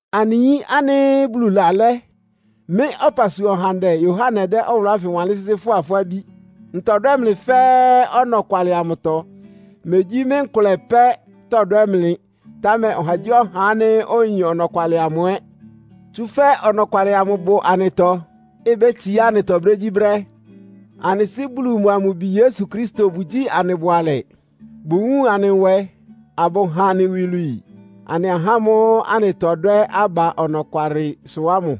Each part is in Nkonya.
Anɩ yín ánɩ́ Bulu lalɛ́, mɩ́ ɔpasua ɔhandɛ Yohane dɛ́ ɔwʋlʋ́ ánfɩ wanlɩ́n sɩ́sɩ́ fʋ́a fʋ́ abí. Ntɔdwɛ́ mlɩ fɛ́ɛ́ ɔnɔkwalɩ amʋtɔ. Megyí mɩ́ nkʋlɛ pɛ́ tɔdwɛ́ mlɩ, támɛ ɔhagyíɔha ánɩ́ oyin ɔnɔkwalɩ amʋ ɛ́. Tsúfɛ́ ɔnɔkwalɩ amʋ bʋ anɩtɔ, ibétsiá anɩtɔ brégyíbrɛ́. Anɩ Sɩ́ Bulu mʋa mʋ Bi Yesu Kristo bʋgyíi anɩ bʋalɛ. Bʋwúun anɩ nwɛ, abʋha anɩ iwilwii, anɩ ahá ámʋ́ʋ́ anɩtɔdwɛ́ aba ɔnɔkwalɩsʋ ámʋ.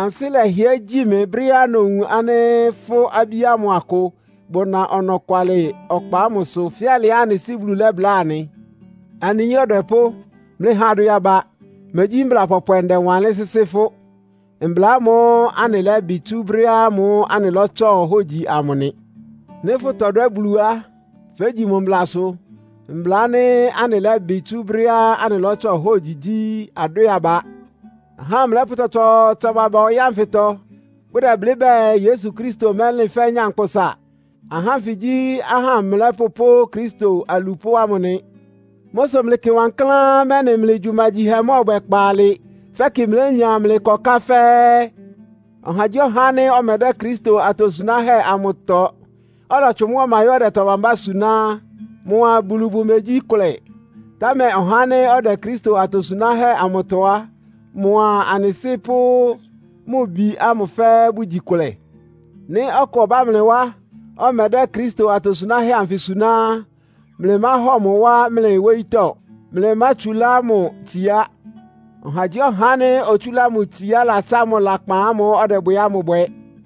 Ansɩ́ lɛhɩɛ́ gyi mɩ brɛ́á nowun ánɩ́ fʋ́ abí ámʋ akʋ bʋna ɔnɔkwalɩ ɔkpa ámʋsʋ, fɛ́ alɩá anɩ Sɩ́ Bulu lɛ́bláa anɩ. Anɩ yín ɔdwɛpʋ́, mlɩha adwɛ aba. Megyí mbla pɔpwɛ ndɛwanlɩ́n sɩ́sɩ́ fʋ́. Mbla ámʋ́ʋ́ anɩlɛ́bɩ tsú brɛ́ ámʋ́ʋ́ anɩlɔ́tsɔ hógyi amʋ nɩ. Nɩ́ fʋtɔdwɛ́ Bulu á, fégyi mʋ mblasʋ. Mbla ánɩ́ anɩlɛ́bɩ tsú brɛ́á anɩlɔ́tsɔ hógyi gyí, adwɛ́ɛ aba. Ahá amlɛ́pʋ́ tsɔtsɔɔtsɔ baba ɔyɩ́ ánfɩtɔ. Bʋdɛblɩ́ bɛɛ Yesu Kristo mɛ́lɩn fɛ́ nyankpʋsa. Ahá ánfɩ gyí ahá amlɛ́pʋ́ pʋ́ Kristo alupʋ́ ámʋ nɩ. Mʋ́ sʋ mlɩkɩ wankláán, mɛ́nɩ mlɩ gyumagyihɛ mɔ́ɔbwɛ kpaalɩ, fɛ́kɩ mlénya mlɩ ɩkɔká fɛ́ɛ́. Ɔhagyíɔha ánɩ́ ɔmɛdɛ́ Kristo atosunáhɛ́ amʋtɔ, ɔlɔtsʋn mʋ́ ɔma yɔ́ ɔdɛ tɔ bambá suná á, mʋa Bulu bʋmegyí kʋlɛ. Támɛ ɔhá ánɩ́ ɔdɛ Kristo atosunáhɛ́ amʋtɔ á, mʋa anɩ Sɩ́ pʋ́ Mʋ Bi ámʋ fɛ́ɛ́ bʋgyi kʋlɛ. Nɩ́ ɔkʋ ɔbá mlɩ wá, ɔmɛdɛ́ Kristo atosunáhɛ́ anfɩ suná á, mlɩmáhɔ mʋ wá mlɩ wóyítɔ́, mlɩmátsulá mʋ itsiá. Ɔhagyíɔha ánɩ́ otsúlá mʋ itsiá latsá mʋ lakpan ámʋ́ʋ́ ɔdɛbwɛ ámʋ bwɛ.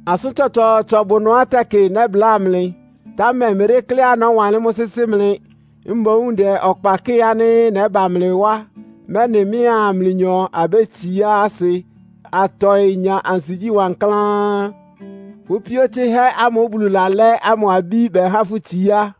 Asʋ́n tsɔtsɔɔtsɔ bʋ ɩnʋá tɛkɩ nɛ́bláa mlɩ, támɛ mmedékléá nɔ́wanlɩ́n mʋ́ sɩ́sɩ́ mlɩ. Mboún ndɛ ɔkpa kɩ́ɩ ánɩ́ nɛ́ba mlɩ wá, mɛ́nɩ mɩ́a mlɩnyɔ abétsiá asɩ, atɔɩ nya ansigyí wankláán. Fʋ́ píó tsɩ́hɛ́ ámʋ́ʋ́ Bulu lalɛ́ ámʋ abí bɛhá fʋ́ itsiá.